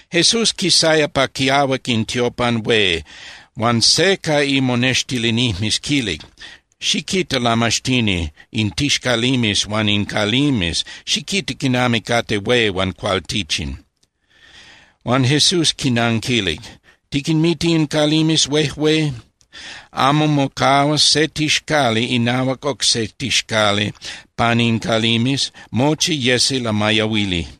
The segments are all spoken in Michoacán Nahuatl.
Jesús quisaya pa quiahuac in tiopan hué, huan se ca imonextilinijmes quilic: —Xiquita, Lamaxtini, in tixcalimes huan in calimes, ¡xiquita quinami cate hué huan cualtichin! Huan Jesús quinanquilic: —¿Tiquinmita in calimes huejué? Amo mocahuas se tixcali inahuac oc se tixcali pan in calimes, mochi yesi lamayahuili.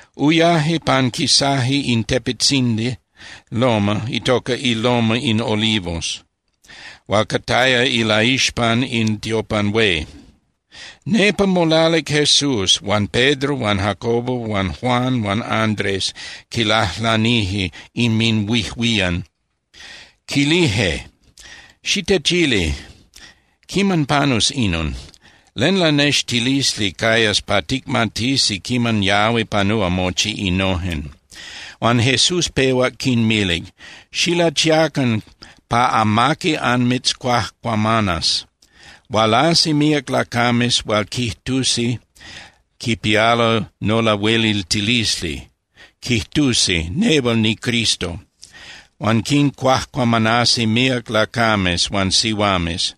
Uyaje panquisaje in tepetzindi (loma) itoca iLoma in Olivos hual cataya ilaixpan in tiopan hué. Nepa molalic Jesús huan Pedro huan Jacobo huan Juan huan Andrés quilajlanije inminhuijuían, quilije: —Xitechili. ¿Quiman panus inon? ¿Len lanextilisli cayas pa ticmatisi quiman yahui panúa mochi innojen? Huan Jesús pehuac quinmilic: —Xilachiacan pa amaqui anmitzcuajcuamanas. Hualasi míac lacames hual quijtusi quipialo nolahueliltilisli, quijtusi: “Nehual niCristo.” Huan quincuajcuamanasi míac lacames huan sihuames.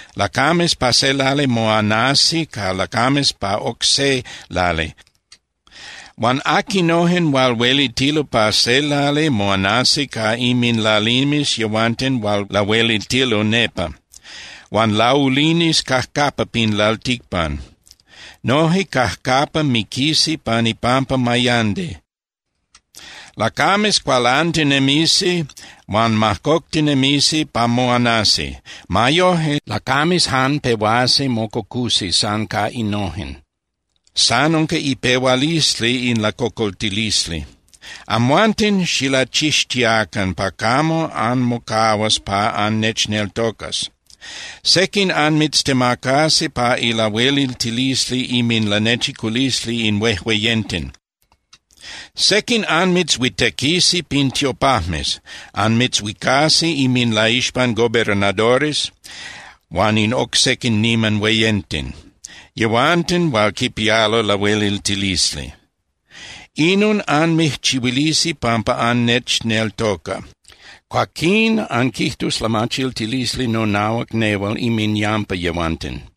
Lacames pa se lali moanasi ca lacames pa oc se lali. Huan aquinojen hual huelitilo pa se lali moanasi ca inminlalimes yehuanten hual lahueliltilo nepa. Huan laulinis cajcapa pin lalticpan. Noje cajcapa miquisi pan ipampa mayandi. Lacames cualantinemisi huan majcoctinemisi pa moanasi. Ma yoje, lacames jan pehuasi mococusi san ca innojen, san unca ipehualisli in lacocoltilisli. ’Amhuanten xilachixtiacan pa camo anmocahuas pa annechneltocas. Sequin anmitztemacasi pa ilahueliltilisli inminlanechiculisli in huejueyenten. Sequin anmitzhuitequisi pin tiopajmes. Anmitzhuicasi inminlaixpan gobernadores huan in oc sequin niman hueyenten, yehuanten hual quipialo lahueliltilisli. Inon anmijchihuilisi pampa annechneltoca. Cuaquín anquijtus lamachiltilisli nonahuac nehual inminyampa yehuanten.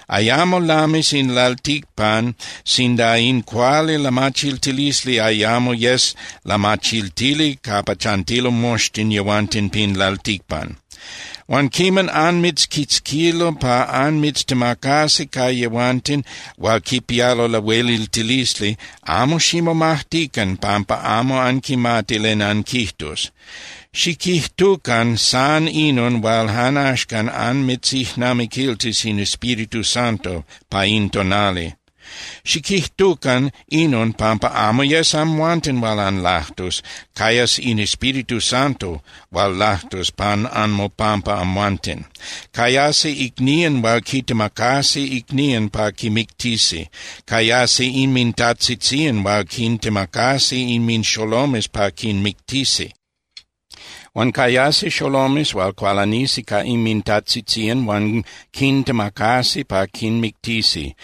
Ayamo lamis in lalticpan sinda in cuali lamachiltilisli ayamo yes lamachiltili capa chantilo moxtin yehuanten pin lalticpan. Huan quiman anmitzquitzquilo pa anmitztemacasi ca yehuanten hual quipialo lahueliltilisli, amo ximomajtican pampa amo anquimati len anquijtus. Xiquijtucan san inon hual jan axcan anmitzijnamiquiltis in Espíritu Santo pa in tonali. Xiquijtucan inon pampa amo yes amhuanten hual anlajtus, cayas in Espíritu Santo hual lajtus pan anmopampa amhuanten. Cayasi icnían hual quitemacasi icnían pa quimictisi. Cayasi inmintajtzitzían hual quintemacasi inminxolomes pa quinmictisi. Huan cayasi xolomes hual cualanisi ca inmintajtzitzían huan quintemacasi pa quinmictisi.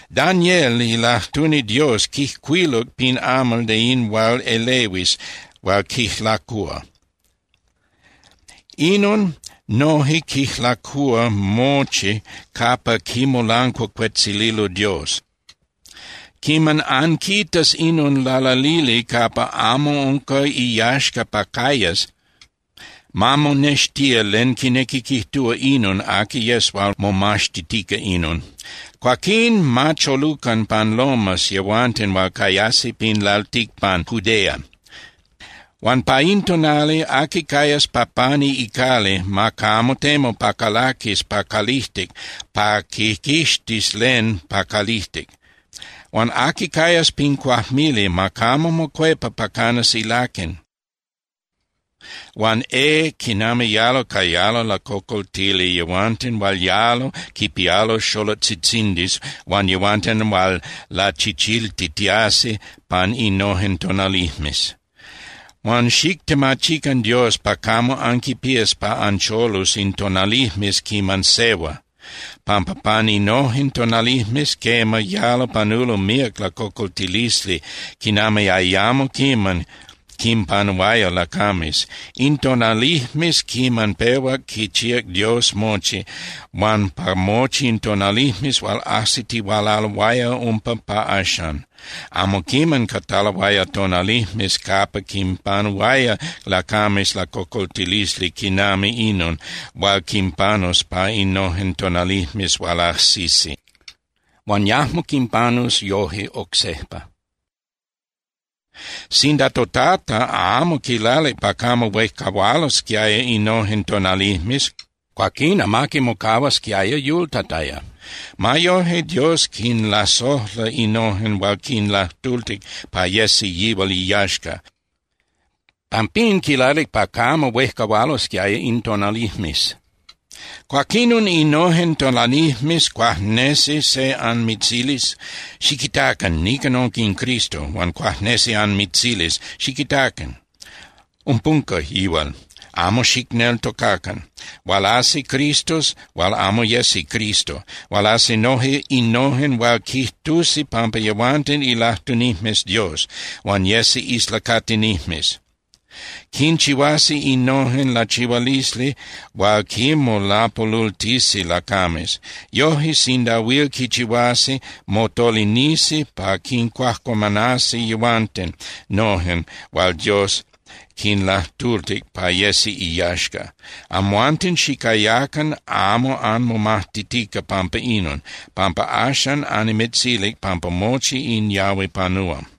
’Daniel ilajtuni Dios quijcuiluc pin amal de in hual elehuis hual quijlacúa. Inon noje quijlacúa mochi capa quimolancuacuetzililo Dios. Quiman anquitas inon lalalili capa amo unca iyaxca pa cayas (ma monextía len quinequi quijtúa inon aqui yes hual momaxtitica inon), cuaquín ma cholucan pan lomas yehuanten hual cayasi pin lalticpan Judea. Huan pa in tonali, aqui cayas pa pani icali ma camo temu pa calaquis pa calijtic pa quiquixtis len pa calijtic. Huan aqui cayas pin cuajmili ma camo mocuepa pa canas ilaquen. Huan ¡eh, quinami yalo cayalo lacocoltili yehuanten hual yalo quipialo xolotzitzindis huan yehuanten hual lachichiltitiasi pan innojen tonalijmes! Huan xictemachican Dios pa camo anquipías pa ancholus in tonalijmes quiman sehua, pampa pan innojen tonalijmes, quema, yalo panulo míac lacocoltilisli quinami ayamo quiman quinpanuaya lacames. In tonalijmes quiman pehuac quichíac Dios mochi, huan pa mochi in tonalijmes hual ajsitihualaloaya umpa pa axan, amo quiman cataloaya tonalijmes capa quinpanuaya lacames lacocoltilisli quinami inon hual quinpanus pa innojen tonalijmes hual ajsisi. Huan yajmo quinpanus yoje oc sejpa. Sinda toTata amo quilalic pa camo huejcahualosquiaya innojen tonalijmes, cuaquín amaqui mocahuasquiaya yultataya. Ma yoje, Dios quinlasojla innojen hual quinlajtultic pa yesi yihual iyaxca. Pampín quilalic pa camo huejcahualosquiaya in tonalijmes. ’Cuaquinon innojen tonalijmes cuajnesi se anmitzilis: “Xiquitacan, nican unca in Cristo.” Huan cuajnesi anmitzilis: “Xiquitacan, umpunca yihual.” Amo xicneltocacan. Hualasi cristos hual amo yesi Cristo. Hualasi noje innojen hual quijtusi pampa yehuanten ilajtunijmes Dios, huan yesi islacatinijmes. Quinchihuasi innojen lachihualisli hual quinmolapolultisi lacames. Yoje, sinda huil quichihuasi, motolinisi pa quincuajcuamanasi yehuanten nojen hual Dios quinlajtultic pa yesi iyaxca. Amhuanten xicayacan amo anmomajtitica pampa inon, pampa axan annimitzilic pampa mochi in yahui panúa.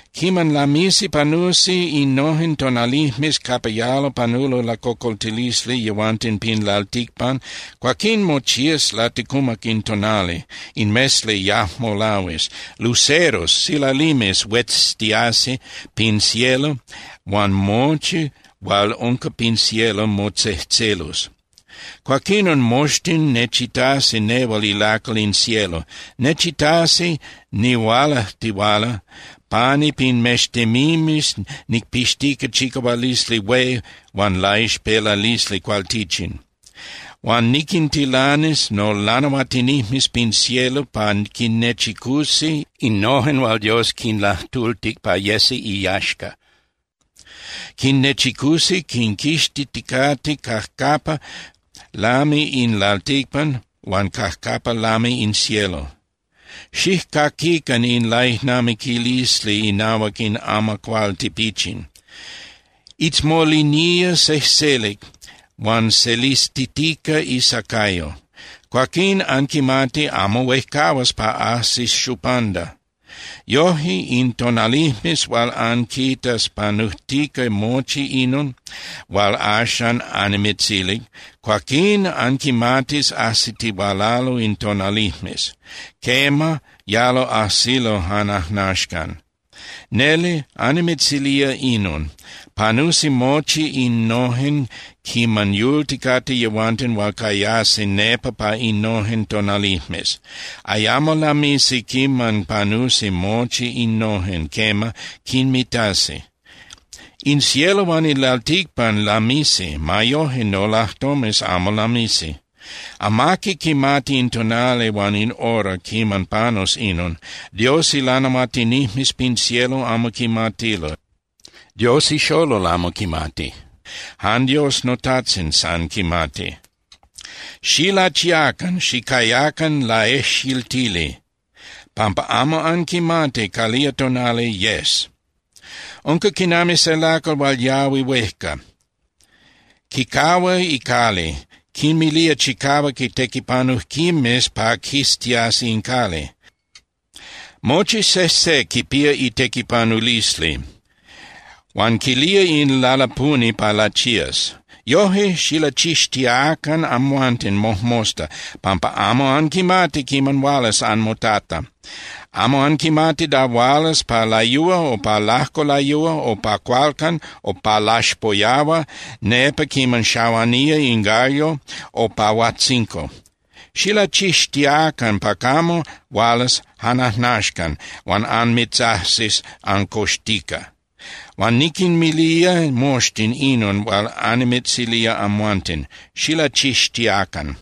’Quiman lamisi panusi innojen tonalijmes capa yalo panulo lacocoltilisli yehuanten pin lalticpan, cuaquín mochías laticumac in tonali. In mesli yajmo lahuis. Luceros (silalimes) hueztiasi pin cielo huan mochi hual unca pin cielo motzejtzelus. Cuaquinon moxtin nechitasi nehual ilacal in cielo. Nechitasi nihualajtihuala pani pin mextemimes nicpixtica chicahualisli hué huan laixpelalisli cualtichin. Huan niquintilanis nolanahuatinijmes pin cielo pa quinnechicusi innojen hual Dios quinlajtultic pa yesi iyaxca. Quinnechicusi quinquixtiticate cajcapa lami in lalticpan huan cajcapa lami in cielo. ’Xijcaquican in laijnamiquilisli inahuac in amacuál tipichin. Itzmolinía sejselic huan selistitica isacayo. Cuaquín anquimati amo huejcahua pa ajsis xupanda. Yoje, in tonalijmes hual anquitas panujtica mochi inon hual axan annimitzilic, cuaquín anquimatis ajsitihualalo in tonalijmes. Quema, yalo ajsilo jan ajnaxcan. Neli annimitzilía inon: Panusi mochi innojen quiman yulticate yehuanten hual cayasi nepa pa innojen tonalijmes, ayamo lamisi quiman panusi mochi innojen, quema, quinmitasi. In cielo huan in lalticpan lamisi. Ma yoje, nolajtomes amo lamisi. ’Amaqui quimati in tonali huan in hora quiman panus inon. Dios ilanahuatinijmes pin cielo amo quimatilo, Dios ixolol amo quimati. Jan Dios noTajtzin san quimati. ’Xilachiacan, xicayacan laejxiltili, pampa amo anquimati calía tonali yes. Unca quinami se lacal hual yahui huejca. Quicahua icali, quinmilía chicahuac itequipanujquimes pa quiztiasi in cali. Mochi sejse quipía itequipanulisli, huan quilía in lalapuni pa lachías. Yoje, xilachixtiacan amhuanten mojmosta, pampa amo anquimati quiman hualas anmoTata. Amo anquimati da hualas pa layúa o pa lajco layúa o pa cualcan o pa laxpoyahua nepa quiman xahuanía in gallo o pa huajtzinco. Xilachixtiacan pa camo hualas jan ajnaxcan huan anmitzajsis ancoxtica. Huan niquinmilía moxtin inon hual annimitzilía amhuanten. Xilachixtiacan.